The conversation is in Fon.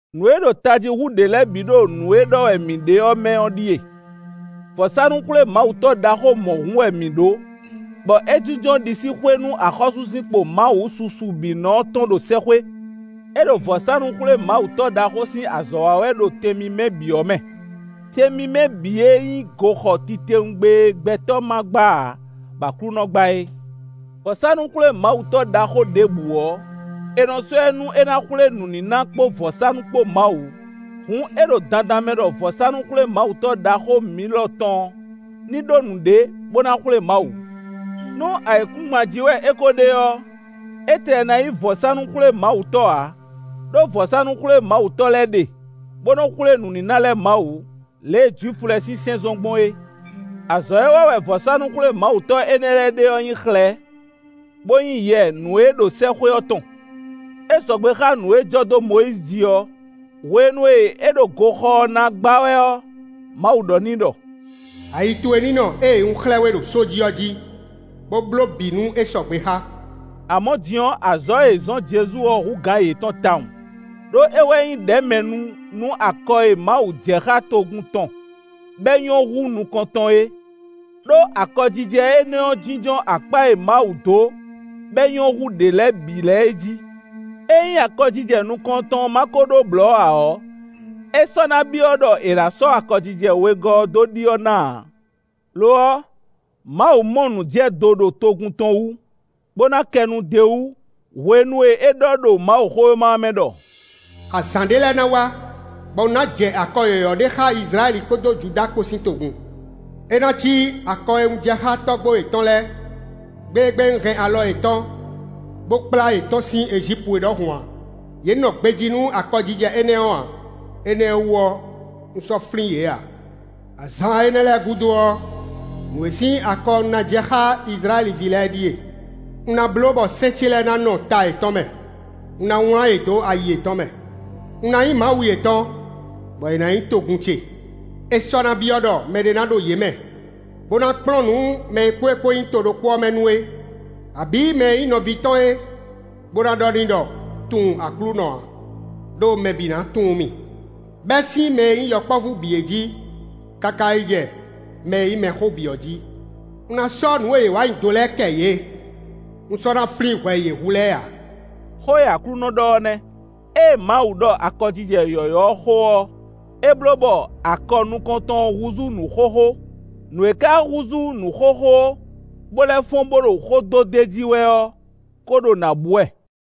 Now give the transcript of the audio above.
Nǔ e ɖo tají hú ɖě lɛ́ɛ bǐ ɖo nǔ e ɖɔ wɛ mǐ ɖe ɔ́ mɛ ɔ́ ɖíe: Vɔ̌sánú-xwlémawutɔ́ ɖaxó mɔ̌hun wɛ mǐ ɖó, bɔ é jínjɔ́n ɖisíxwé nú axɔ́súzinkpo Mawu susu bǐ nɔ ɔ́ tɔn ɖo sɛ́xwé. É ɖo vɔ̌sánú-xwlémawutɔ́ ɖaxó sín azɔ̌ wa wɛ ɖo Tɛn mímɛ́ bǐ ɔ́ mɛ; Tɛn mímɛ́ bǐ e nyí goxɔ titewungbe e gbɛtɔ́ ma gbá ǎ, bɔ Aklúnɔ gbá é. Vɔ̌sánú-xwlémawutɔ́ ɖaxó ɖěbǔ ɔ́, è nɔ sɔ́ ɛ nú é ná xwlé nǔníná kpó vɔ̌sánú kpó Mawu. Hǔn é ɖo dandan mɛ ɖɔ vɔ̌sánú-xwlémawutɔ́ ɖaxó mǐ lɔ tɔn ní ɖó nǔɖé bó ná xwlé Mawu. Nú ayǐkúngban jí wɛ é ko ɖe ɔ́, é tlɛ ná nyí vɔ̌sánú-xwlémawutɔ́ ǎ, ɖó vɔ̌sánú-xwlémawutɔ́ lɛ́ɛ ɖe, bó nɔ xwlé nǔníná lɛ́ɛ Mawu, lě e Jwifu lɛ́ɛ sín sɛ́n zɔ́n gbɔn é. Azɔ̌ e wa wɛ vɔ̌sánú-xwlémawutɔ́ énɛ́ lɛ́ɛ ɖe ɔ́ nyí xlɛ̌, bó nyí yɛ nǔ e ɖo sɛ́xwé ɔ́ tɔn. É sɔgbe xá nǔ e jɔ dó Mɔyízi ji ɔ́. Hwenu e é ɖo goxɔ ɔ́ na gbá wɛ ɔ́, Mawu ɖɔ n'i ɖɔ: “Ayi towe ní nɔ ée un xlɛ́ we ɖo só jí ɔ́ jí, bó bló bǐ nú é sɔgbe xá.” Amɔ̌ din ɔ́, azɔ̌ e è zɔ̌n Jezu ɔ́ hú gǎn yětɔn tawun, ɖó é wɛ nyí ɖɛ̌mɛnu nú akɔ e Mawu jɛ xá togun tɔn bɔ é nyɔ́ hú nukɔntɔn é; ɖó akɔjijɛ énɛ́ ɔ́ jínjɔ́n akpá e Mawu dó bɔ é nyɔ́ hú ɖě lɛ́ɛ bǐ lɛ́ɛ é jí. Ényí akɔjijɛ nukɔntɔn ɔ́ ma ko ɖó blɔ̌ ǎ ɔ́, é sɔ́ ná byɔ́ ɖɔ è nǎ sɔ́ akɔjijɛ wegɔ́ ɔ́ dó ɖyɔ́ ná ǎ. Lo ɔ́, Mawu mɔ nǔjɛdo ɖo togun tɔn wú, bó ná kɛ nu d'é wú hwenu e é ɖɔ ɖo Mawuxówéma ɔ́ mɛ ɖɔ: “Azǎn ɖé lɛ́ɛ ná wá, bɔ un ná jɛ akɔ yɔ̌yɔ́ ɖé xá Izlayɛ́li kpódó Judáa kpó sín togun. É ná cí akɔ e un jɛ xá tɔ́gbó yětɔn lɛ́ɛ, gbe e gbe un hɛn alɔ yětɔn, bó kplá yě tɔ́n sín Ejípu é ɖɔhun ǎ; yě nɔ gbejí nú akɔjijɛ énɛ́ ɔ́ ǎ. Énɛ́ ɔ́ wú ɔ́, un sɔ́ flín yě ǎ. Azǎn énɛ́ lɛ́ɛ gúdo ɔ́, nǔ e sín akɔ un ná jɛ xá Izlayɛ́li ví lɛ́ɛ é ɖíe: Un ná bló bɔ sɛ́n ce lɛ́ɛ ná nɔ ta yětɔn mɛ; un ná wlán yě dó ayi yětɔn mɛ; un ná nyí Mawu yětɔn, bɔ yě ná nyí togun ce. É sɔ́ ná byɔ́ ɖɔ mɛɖé ná ɖo yě mɛ, bó ná kplɔ́n nǔ mɛ e kpó é kpó nyí to ɖokpó ɔ́ mɛ nu é, abǐ mɛ e nyí nɔví tɔn é, bó ná ɖɔ n'i ɖɔ: ‘Tunwun Aklúnɔ’ ǎ. Đó mɛ bǐ ná tunwun mì, bɛ́ sín mɛ e nyí yɔkpɔ́vú bǐ é jí, káká yi jɛ mɛ e nyí mɛxó bǐ ɔ́ jí. Un ná sɔ́ nǔ e yě wa nyi do lɛ́ɛ kɛ yě; un sɔ́ ná flín hwɛ e yě hu lɛ́ɛ ǎ.” Xó e Aklúnɔ ɖɔ ɔ́ nɛ́. Ée Mawu ɖɔ akɔjijɛ yɔ̌yɔ́ ɔ́ xó ɔ́, é bló bɔ akɔ nukɔntɔn ɔ́ húzú nǔ xóxó; nǔ e ka húzú nǔ xóxó, bó lɛ́ fɔ́n bó ɖo xó dó d'é jí wɛ ɔ́ kó ɖo nǎ bú wɛ.